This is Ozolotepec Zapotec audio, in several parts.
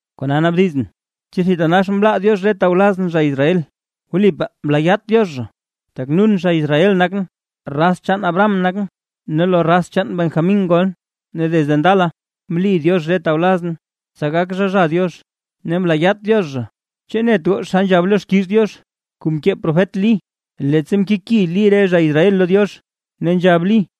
Kona naabdizʼn: ¿Chu thitanax mlaa Diox re tawlazʼn zha Israel? ¡Wlipaa mlaayaat Diox zha! Tak non zha Israel nakʼn, raz chaan Abraham nakʼn, ne lo raz chaan Benjamín ngolʼn. Ne desde ndala, mli Diox re tawlazʼn tsa gak zha, zha Diox; ne mlaayaat Diox zha. ¿Chu net goo xa nzhab lo xkiiz Diox kuu mkee profet Lí? Leettsa mkeki Lí re zha Israel lo Diox, ne nzhab Lí: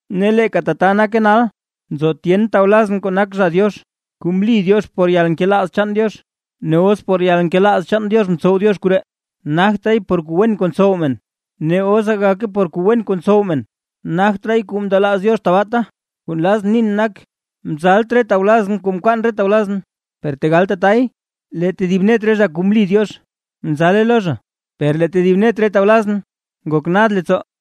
Ne leeka tata nake nal, nzo tyen tawlazʼn kuu nak zha Diox, kuu mli Diox por yalnkelaaz chaan Diox. Ne os por yalnkelaaz Diox mtsow Diox koree, nagtraay por kuu wen kuu ntsow men; ne os gagake por kuu wen kuu ntsow men, nagtraay kuu mndelaaz Diox tabaata. Kuu nlazʼn nin nak, mzalt re tawlazʼn kuu mkwaan re tawlazʼn. Per tegal tatay lee tedib net re zha kuu mli Diox, mzale lo zha; per lee tedib net re tawlazʼn, ngok nad leettsoo.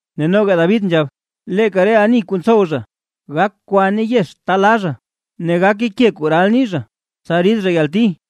Ne noga David nzhab: Leeka re ani kuu ntsow zha gak kwa ne yex ta la zha, ne gake ke kuu ral nii zha tsa rid zha yalti.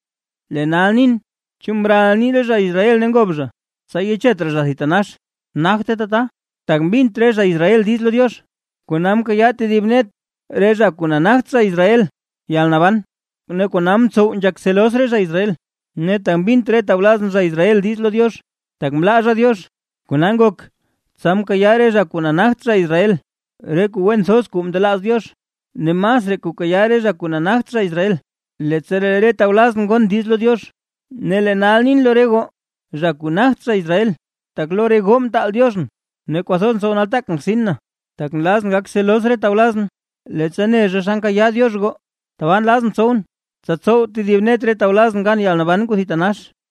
Lee nal nin: ¿Chu mral nii re zha Israel ne ngob zha, tsa yechet raa zha thitanax? ¡Nagte tata! Tak mbint re zha Israel diiz lo Diox, kona mkayaa tedib net re zha kuu nagt zha Israel yalnaban kuu thitatax, ne kona mtsow nzhak celos re zha Israel. Ne tak mbint re tawlazʼn zha Israel diiz lo Diox, tak mlaa zha Diox, kona ngok tsa mkayaa re zha kuu nagt zha Israel re kuu wen thoz kuu ndelaaz Diox; ne masraa kuu kayaa re zha kuu nagt zha Israel, leettsa lee re tawlazʼn gon diiz lo Diox. Ne lee nal nin lo re goo zha kuu nagt zha Israel, tak lo re goo mtaal Dioxʼn ne kwathoz ntsow nataak na rtsin na, tak nlazʼn gak celos re tawlazʼn, leettsa ne zha xa nkayaa Diox goo, tabaa nlazʼn tsowʼn tsa tsow thib net re tawlazʼn gan yalnaban kuu thitanax.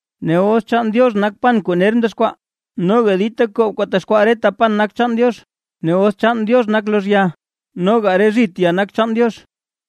Ne os chaan Diox nak pan kuu ner mdexkwaa, noga dita koob kuu texkwaa reta pan nak chaan Diox. Ne os chaan Diox nak lozh ya, noga re zhit ya nak chaan Diox.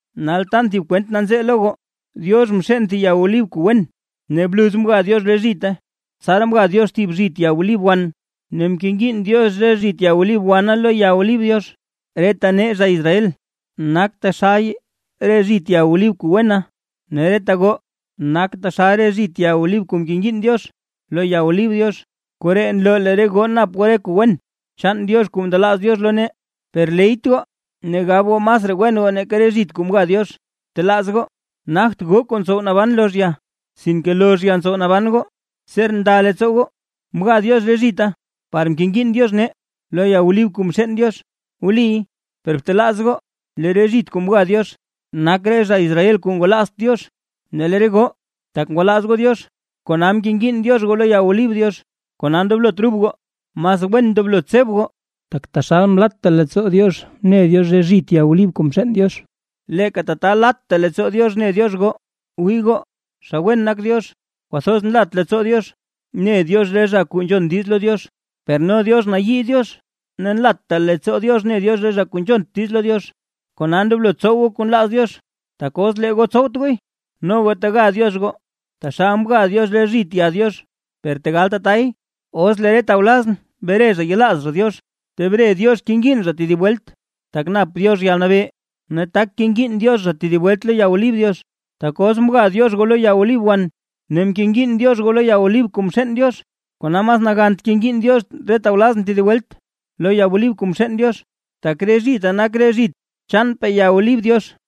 Nal tan thib kwent nanzee lo goo. Diox mxeen thib ya olib kuu wen, ne bluz mga Diox re zhite. Tsaraa mga Diox thib zhit ya olib wan, ne mkengiin Diox re zhit ya olib wana lo ya olib Diox. Reta nee zha Israel, nak taxal re zhit ya olib kuu wena, ne reta goo nak taxal re zhit ya olib kuu mkengiin Diox lo ya olib Diox. Koree nloo lee re goo nap goo re kuu wen chaan Diox kuu ndelaaz Diox lo nee. Per leyt goo ne gab goo masraa wen goo nake re zhit kuu mga Diox. Btelaaz goo nagt goo kuu ntsow naban lozh ya, sinke lozh ya ntsow naban goo. Ser nda leettsoo goo: “Mga Diox re zhita par mkengiin Diox nee lo ya olib kuu mxeen Diox”. Wliy; per btelaaz goo lee re zhit kuu mga Diox, nak re zha Israel kuu ngwalaazt Diox; ne lee re goo tak ngwalaaz goo Diox kona mkengiin Diox goo lo ya olib Diox. Kona ndoblot rub goo, mas wen ndoblo tseb goo. Tak taxal mlatta leettsoo Diox mne Diox re zhit ya olib kuu mxeen Diox, leeka tata latta leettsoo Diox ne Diox goo. Wii goo, xa wen nak Diox kwathoz nlat leettsoo Diox ne Diox re zha kuu nzhon diiz lo Diox. Per no Diox nayii Diox ne nlatta leettsoo Diox ne Diox re zha kuu nzhont diiz lo Diox. Kona ndoblo tsow goo kuu nlaaz Diox, tak os lee goo tsowt gooy no goo tega Diox goo taxal mga Diox re zhit ya Diox. Per tegal tatay, os lee re tawlazʼn bre zha yelaaz zha Diox, tebre Diox kengiin Diox zha tedib welt; tak nap Diox yalnabee ne tak kengiin Diox zha tedib welt lo ya olib Diox. Tak os mga Diox goo lo ya olib wan ne mkengiin Diox goo lo ya olib kuu mxeen Diox, ¡kona mas nagant kengiin Diox re tawlazʼn tedib welt lo ya olib kuu mxeen Diox, tak re zhita nak re zhit chaanpaa ya olib Diox!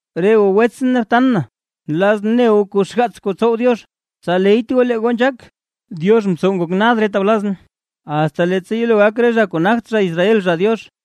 Re goo wetsʼn ne btan na, nlazʼn ne goo kuu xgaats kuu tsow Diox, tsa leyt goo lee goo nzhaak; Diox mtsow ngok nad re tawlazʼn, asta leettsa yelo gak re zha kuu nagt zha Israel, zha Diox.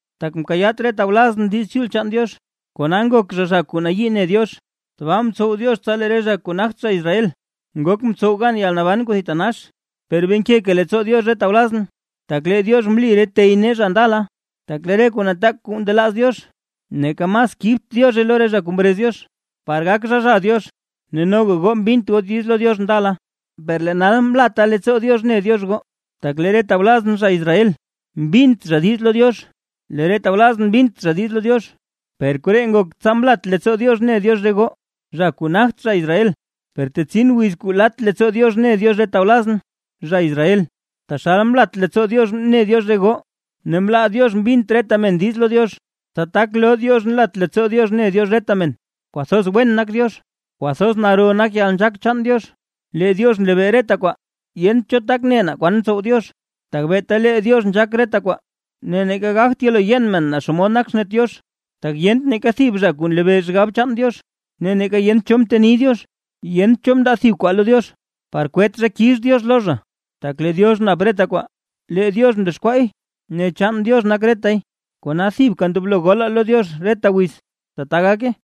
Tak mkayaat re tawlazʼn Diiz Chul chaan Diox, kona ngok zha, zha kuu nayii ne Diox. Tbaa mtsow Diox tsa lee re zha kuu nagt zha Israel, ngok mtsow gan yalnaban kuu thitanax. Per bee nkeka leettsoo Diox re tawlazʼn, tak lee Diox mli re tey nee zha ndala. Tak lee re kuu nataak kuu ndelaaz Diox, neeka mas kibt Diozhe lo re zha kuu mrez Diox, par gak zha, zha Diox. Ne noga goo mbint goo diiz lo Diox ndala, per lee nal mlatta leettsoo Diox ne Diox goo, tak lee re tawlazʼn zha Israel, mbint zha diiz lo Diox. Lee re tawlazʼn mbint zha diiz lo Diox, per koree ngok tsa mlat leettsoo Diox mne Diox re goo zha kuu nagt zha Israel; per tetsin wiz kuu lat leettsoo Diox ne Diox re tawlazʼn, zha Israel, taxal mlat leettsoo Diox mne Diox goo. Ne mlaa Diox mbint reta men diiz lo Diox, tsa tak loo Diox nlat leettsoo Diox ne Diox reta men. ¡Kwathoz wen nak Diox! ¡Kwathoz naro nak yalnzhaak chaan Diox, lee Diox nlebee reta kwaa! Yent cho tak ne naa kwan tsow Diox, tak beeta lee Diox nzhaak reta kwaa, ne neeka gagt yelo yen men naa xomod nak xnet Diox. Tak yent neeka thib zha kuu nlebee xgab chaan Diox ne neeka yent cho mteni Diox. Yent cho zha mndaa thib kwaa lo Diox, par kwet zha kix Diox lo zha. Tak lee Diox nap reta kwaa, lee Diox mdexkwaay ne chaan Diox nak retay. ¡Kona thibka ndoblo golaa lo Diox reta wiz! ¡Tata gake!